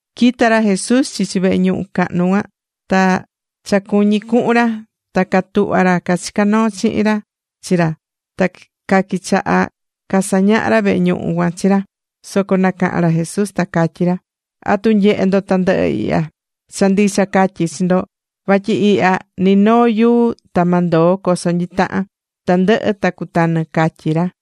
Quita̱ ra Jesús chichi vehe ñuhu cahnu cuan, ta cha cuñí cuhun ra, ta catuhva̱ ra cachicá noo chihin ra chi ra, ta quichaha̱ casañaha ra vehe ñuhu cuan chi ra. Soco nacaha̱n ra Jesús ta catyí ra: ―¿Atu nyehé ndo tandɨhɨ ihya? Cha ndicha catyí chi ndo, vatyi ihya ni noo yuu ta ma ndoo coso nyitahan. Tandɨhɨ ta cutanɨ ―catyí ra.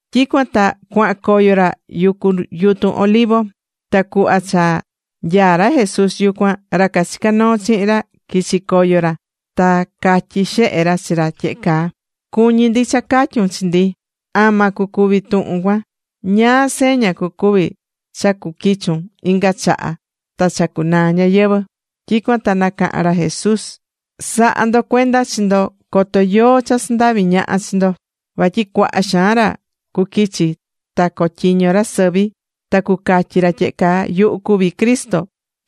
Tyicuan ta cuahan coyo ra yucu yutun Olivo. Ta cuhva cha nyaá ra Jesús yucuan, ra cachicá noo chihin ra quichi̱ coyo ra ta catyí xehe ra chi ra tyehe caa: ―Cuñí ndi cha ca̱tyun chi ndi, ama cucuvi tuhun cuan. ¿Ñáá seña cucuvi cha cuquichun inga chaha ta cha cunaa ñayɨvɨ̱? Tyicuan ta nacaha̱n ra Jesús: ―Sa̱ha ndo cuenda chi ndo coto yóó cha sandahvi ñaha chi ndo. Vatyi cuaha xaan ra cuquichi, ta cotyiño ra sɨvi, ta cucatyi ra tyehe caa: “Yuhu cuví Cristo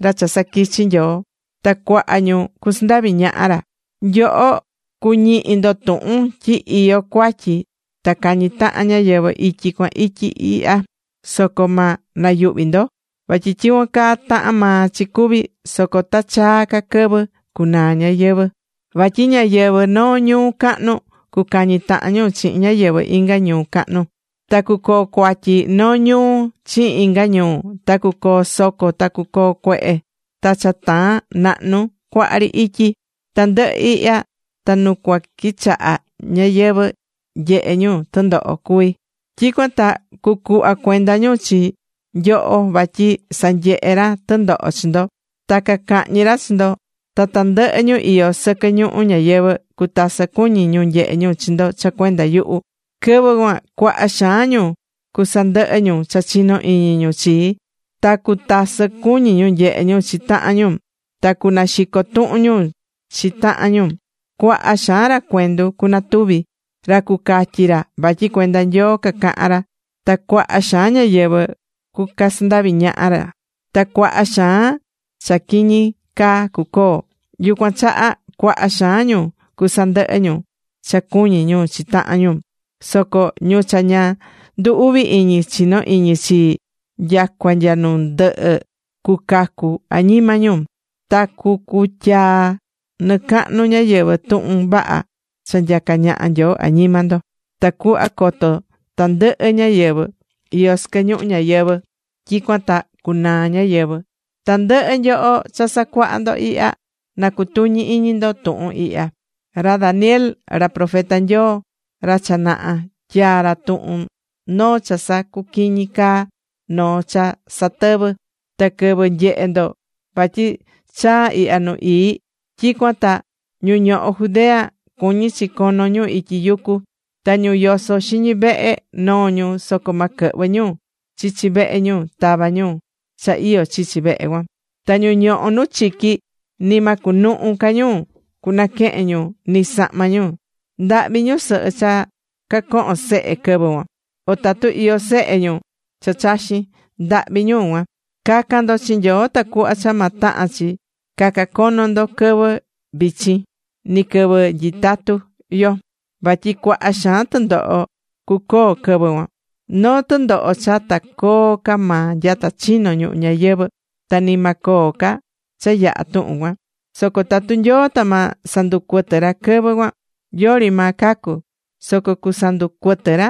ra cha saquichi Nyoo.” Ta cuaha ñu cusandavi ñaha ra. Nyoho cuñihi ndo tuhun tyi iyó cuatyi ta cañí tahan ñáyɨvɨ ityi cuan ityi ihya. Soco ma nayuhvi ndo, vatyi tyicuan caa tahán maa chi cuvi. Soco ta chaa ca quɨvɨ cunaa ñayɨvɨ̱. Vatyi ñáyɨvɨ noo ñuu cahnu, cucañi tahan ñu chihin ñáyɨvɨ inga ñuu cahnu. Ta cucoo cuatyi noo ñuu chihin inga ñuu. Ta cucoo soco, ta cucoo cuehe, ta cha taan nahnu cuaha ri ityi. Tandɨhɨ ihya ta nu cua quichaha ñáyɨvɨ nyehe ñu tɨndoho cuví. ’Tyicuan ta cucuhva cuenda ñu chi nyoho vatyi sanyehe ra tɨndoho chi ndo. Ta cacahñi ra chi ndo. Ta tandɨhɨ ñu iyó sɨquɨ ñuhu ñayɨvɨ̱ cutasɨ cuñi nyehe ñu chi ndo cha cuenda yuhu. Quɨvɨ cuan cuaha xaan ñu cusandɨhɨ ñu cha chino iñi ñu chii, ta cutasɨ cuñi ñu nyehe ñu chi tahan ñu. Ta cunaxico tuhun ñu chi tahan ñu. Cuaha xaan ra cuendu cunatuvi, ta cucatyi ra vatyi cuenda Nyoo cacahan ra. Ta cuaha xaan ñáyɨvɨ cucasandavi ñaha ra. Ta cuaha xaan cha quiñi caa cucoo. Yucuan chaha cuaha xaan ñu cusandɨhɨ ñu cha cuñi ñu chi tahan ñu. Soco ñu cha ña ndu uvi iñi chino iñi chii nyacua nya nu ndɨhɨ, cucacu añima ñu. Ta cucutya nɨcahnu ñayɨvɨ̱ tuhun vaha cha nyacá ñaha Nyoo añima ndo, tacuhva coto tandɨhɨ ñáyɨvɨ iyó sɨquɨ ñuhu ñayɨvɨ, tyicuan ta cunaa ñayɨvɨ̱. ’Tandɨhɨ nyoho cha sacuahá ndo ihya, na cutuñi iñi ndo tuhun ihya: Ra Daniel, ra profeta Nyoo ta cha naha, tyaa̱ ra tuhun noo cha sacuquiñí caa, noo cha satɨvɨ́. Ta quɨvɨ nyehe ndo vatyi chaa ihya Nu Ii, tyicuan ta ñu ñohó Judea, cuñí chi cono ñu ityi yucu. Ta ñu yosó xiñi vehe, noo ñu, soco ma quɨhvɨ ñu chichi vehe ñu tava ñu cha iyó chichi vehe cuan. Ta ñu ñohó nu chiqui, ni ma cunuhu ca ñu cunaquehen ñu ni sahma ñu. ¡Ndahvi ñusɨhɨ cha cañohó sehe quɨvɨ cuan! O tatu iyó sehe ñu cha chaxín, ¡ndahvi ñu cuan! Ca̱can ndo chi Nyoo tacuhva cha ma tahan chi caca cono ndo quɨvɨ vichin, ni quɨvɨ nyitatú yo. Vatyi cuaha xaan tɨndoho cucoo quɨvɨ cuan, noo tɨndoho cha ta coo ca maa nyata chino̱ ñuhu ñayɨvɨ̱, ta ni ma coo ca cha yaha tuhun cuan. Soco tatu Nyoo, ta ma sanducuɨtɨ ra quɨvɨ cuan, yori maa cacu. Soco cusanducuɨtɨ ra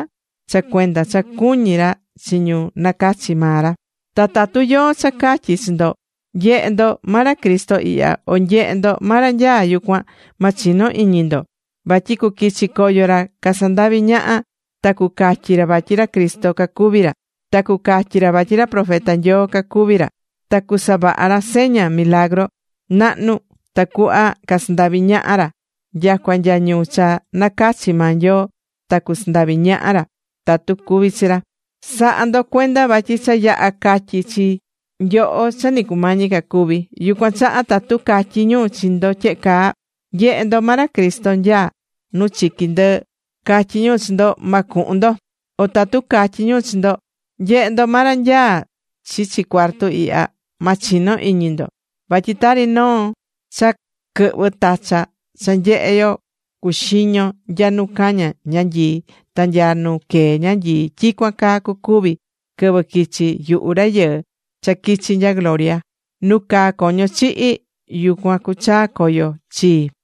cha cuenda cha cuñí ra chi ñu nacachi̱ maa ra. ’Ta tatu yóó cha catyí chi nyoho: “Nye̱he ndo, ma ra Cristo ihya” o “Nye̱he ndo ma ra nyaá yucuan”, ma chino iñi ndo. Vatyi cuquichi coyo ra casandavi ñaha ta cucatyi ra vatyi ra Cristo cacuví ra. Ta cucatyi ra vatyi ra profeta Nyoo cacuví ra. Ta cusavaha ra seña ta milagru nahnu tacuhva casandavi ñaha ra. Nyacua nya ñu cha nacachi̱ maa Nyoo ta cusandavi ñaha ra tatu cuví chi ra. Sa̱ha ndo cuenda vatyi cha yaha̱ catyi chi nyoho cha ni cumañi ca cuvi. Yucuan chaha tatu catyí ñu chi ndo tyehe caa: “Nye̱he ndo, ma ra Cristo nyaá nu chiqui ndɨɨ cuan”, catyí ñu chi ndo, ma cuhun ndo. O tatu catyí ñu chi ndo: “Nye̱he ndo, ma ra nyaá chichi cuartu ihya”, ma chino iñi ndo. Vatyi tari noo cha quɨhvɨ tacha cha nyehé yo cuxiño nya nu caña ñanyii ta nya nu quee ñanyii, tyicuan caa cucuvi quɨvɨ quichi yuhu Rayɨɨ cha quichi nya gloria. Nu caá coño chihi̱, yucuan cuchaa coyo chii.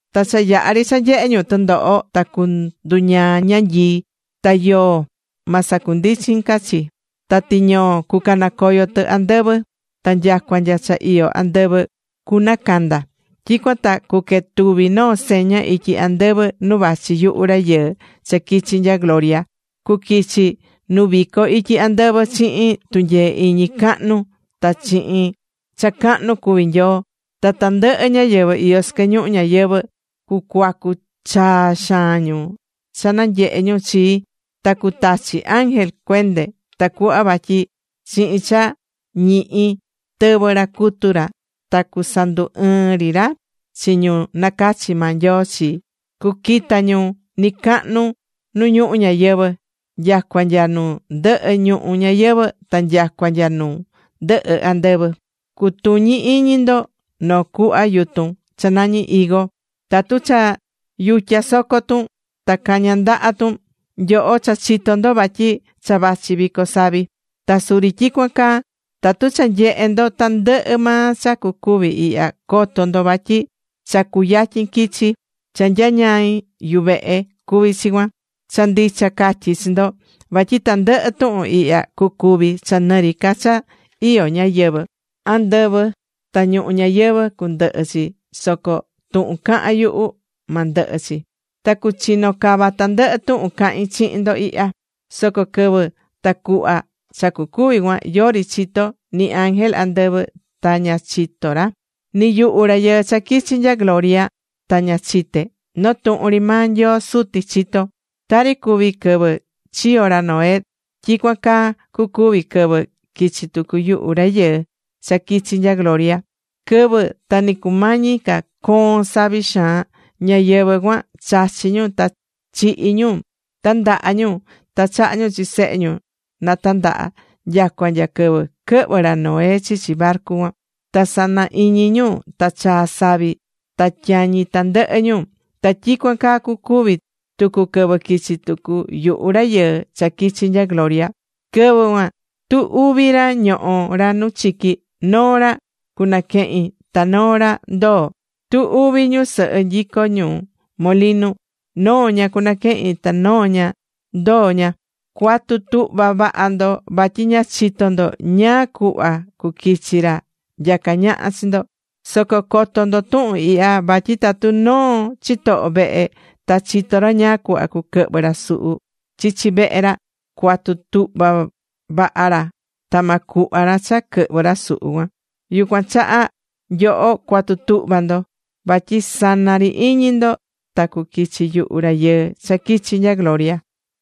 ’Ta cha yahá ri cha nyehé ñu tɨndoho, ta cunduñaa ñanyii, ta yoo ma sacundichin ca chi. Ta tiñoo cucanacoyo tɨ andɨvɨ, ta nyacua nya cha iyó andɨvɨ cunacanda. Tyicuan ta cuquetuvi noo seña ityi andɨvɨ nu vachi yuhu Rayɨɨ cha quichi̱ nya gloria. Cuquichi nu vico ityi andɨvɨ chihin tunyee iñi cahnu ta chihin cha cahnu cuví Nyoo. Ta tandɨhɨ ñáyɨvɨ iyó sɨquɨ ñuhu ñayɨvɨ̱, cucuacu chaa xaan ñu cha nanyehe ñu chii. Ta cutachi ángel cuende tacuhva vatyi chihin cha ñihi tɨvɨ ra cutu ra ta cusandu ɨɨn ri ra chi ñu nacachi̱ maa Nyoo chi, cuquita ñu nɨcacahnu nu ñuhu ñayɨvɨ̱, nyacua nya nu ndɨhɨ ñuhu ñayɨvɨ̱ ta nyacua nya nu ndɨhɨ andɨvɨ. ’Cu̱tuñi iñi ndo noo cuhva yutun cha nañí higo: Tatu cha yutya soco tun, ta caña ndaha tun, nyoho cha chitó ndo vatyi cha vachi vico savi. Ta suri tyicuan caa, tatu cha nyehé ndo tandɨhɨ maa cha cucuvi ihya, co̱to ndo vatyi cha cuyatyin quichi. Cha nyañaí yuvehe cuví chi cuan. Cha ndicha catyí chi ndo vatyi tandɨhɨ tuhun ihya, cucuvi cha nɨ ri ca cha iyó ñáyɨvɨ. Andɨvɨ ta ñuhu ñayɨvɨ̱ cundɨhɨ chi, soco tuhun cahán yuhu, ma ndɨhɨ chi. Ta cuchino cava tandɨhɨ tuhun cahin chihin ndo ihya. ’Soco quɨvɨ ta cuhva cha cucuvi cuan, yori chitó, ni ángel andɨvɨ ta ña chitó ra. Ni yuhu Rayɨɨ cha quichi̱ nya gloria ta ña chité. Noo tuhun ri maa Nyoo Suti chitó ra. ’Tari cuvi̱ quɨvɨ chiyo̱ ra Noé, tyicuan caa cucuvi quɨvɨ quichi tucu yuhu Rayɨɨ cha quichi nya gloria. Quɨvɨ ta ni cumañi ca coon savi xaan, ñáyɨvɨ cuan, chachí ñu, ta chihí ñu, tandahá ñu, ta chahá ñu chi sehe ñu tandaha nyacua nya quɨvɨ quɨhvɨ̱ ra Noé chichi barcu cuan. Ta sana iñi ñu ta chaa̱ savi ta tyañi̱ tandɨhɨ ñu. Ta tyicuan caa cucuvi tucu quɨvɨ quichi tucu yuhu Rayɨɨ cha quichi̱ nya gloria. Quɨvɨ cuan, tu uvi ra ñohó ra nu chiqui. Noo ra cunaquehin, ta noo ra ndoo ra. Tu uvi ñusɨhɨ nyicó ñu molinu. Noo ña cunaquehin, ta noo ña ndoo ña. Cua̱tu tuhva vaha ndo vatyi ña chitó ndo ñáá cuhva cuquichi ra nyacá ñaha chi ndo. Soco co̱to ndo tuhun ihya vatyi tatu noo chitoho vehe ta chitó ra ñáá cuhva cuquɨhvɨ ra suhu chichi vehe ra, cuatu tuhva vaha ra ta ma cuhva ra cha quɨhvɨ ra suhu cuan. Yucuan chaha nyoho, cua̱tu tuhva ndo. Vatyi sana ri iñi ndo, ta cuquichi yuhu Rayɨɨ cha quichi nya gloria.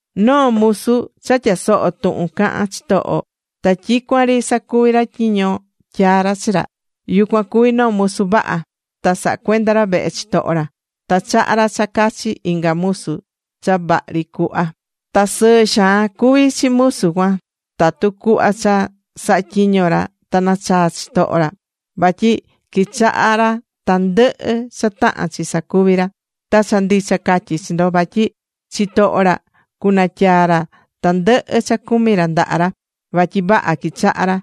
’Noo musu cha tyasohó tuhun cahán chitoho, ta tyicuan ri sacuví ra tyiño tyaa̱ ra chi ra, yucuan cuví noo musu vaha. Ta sahá cuenda ra vehe chitoho ra. Ta chahá ra cha cachi inga musu cha vahri cuhva. Ta sɨɨ xaan cuví chi musu cuan tatu cuhva cha sahá tyiño ra ta nachaa chitoho ra. Vatyi quichahá ra tandɨhɨ cha tahán chi sacuvi ra. Ta cha ndicha catyí chi ndo, vatyi chitoho ra cunatyaa ra tandɨhɨ cha cumí ra ndaha ra, vatyi vaha quichahá ra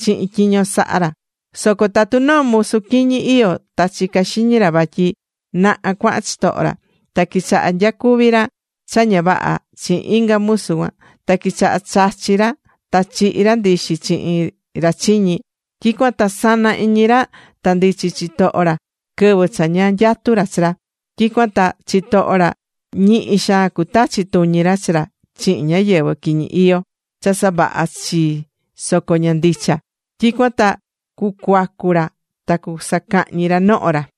chihin tyiño sahá ra. Soco tatu noo musu quiñi iyó ta chicá xiñi ra vatyi naha cuahan chitoho ra, ta quichaha nyacuvi ra cha ña vaha chihin inga musu cuan, ta quichaha chachi ra ta chihi ra ndixi chihin ra chiñi, tyicuan ta sana iñi ra ta ndichi chitoho ra quɨvɨ cha ña nyatú ra chi ra. Tyicuan ta chitoho ra ñihi xaan cutachi tuñi ra chi ra chihin ñáyɨvɨ quiñi iyó cha savaha chii soco ña ndicha. Tyicuan ta cucuacu ra ta cusacahñi ra noho ra.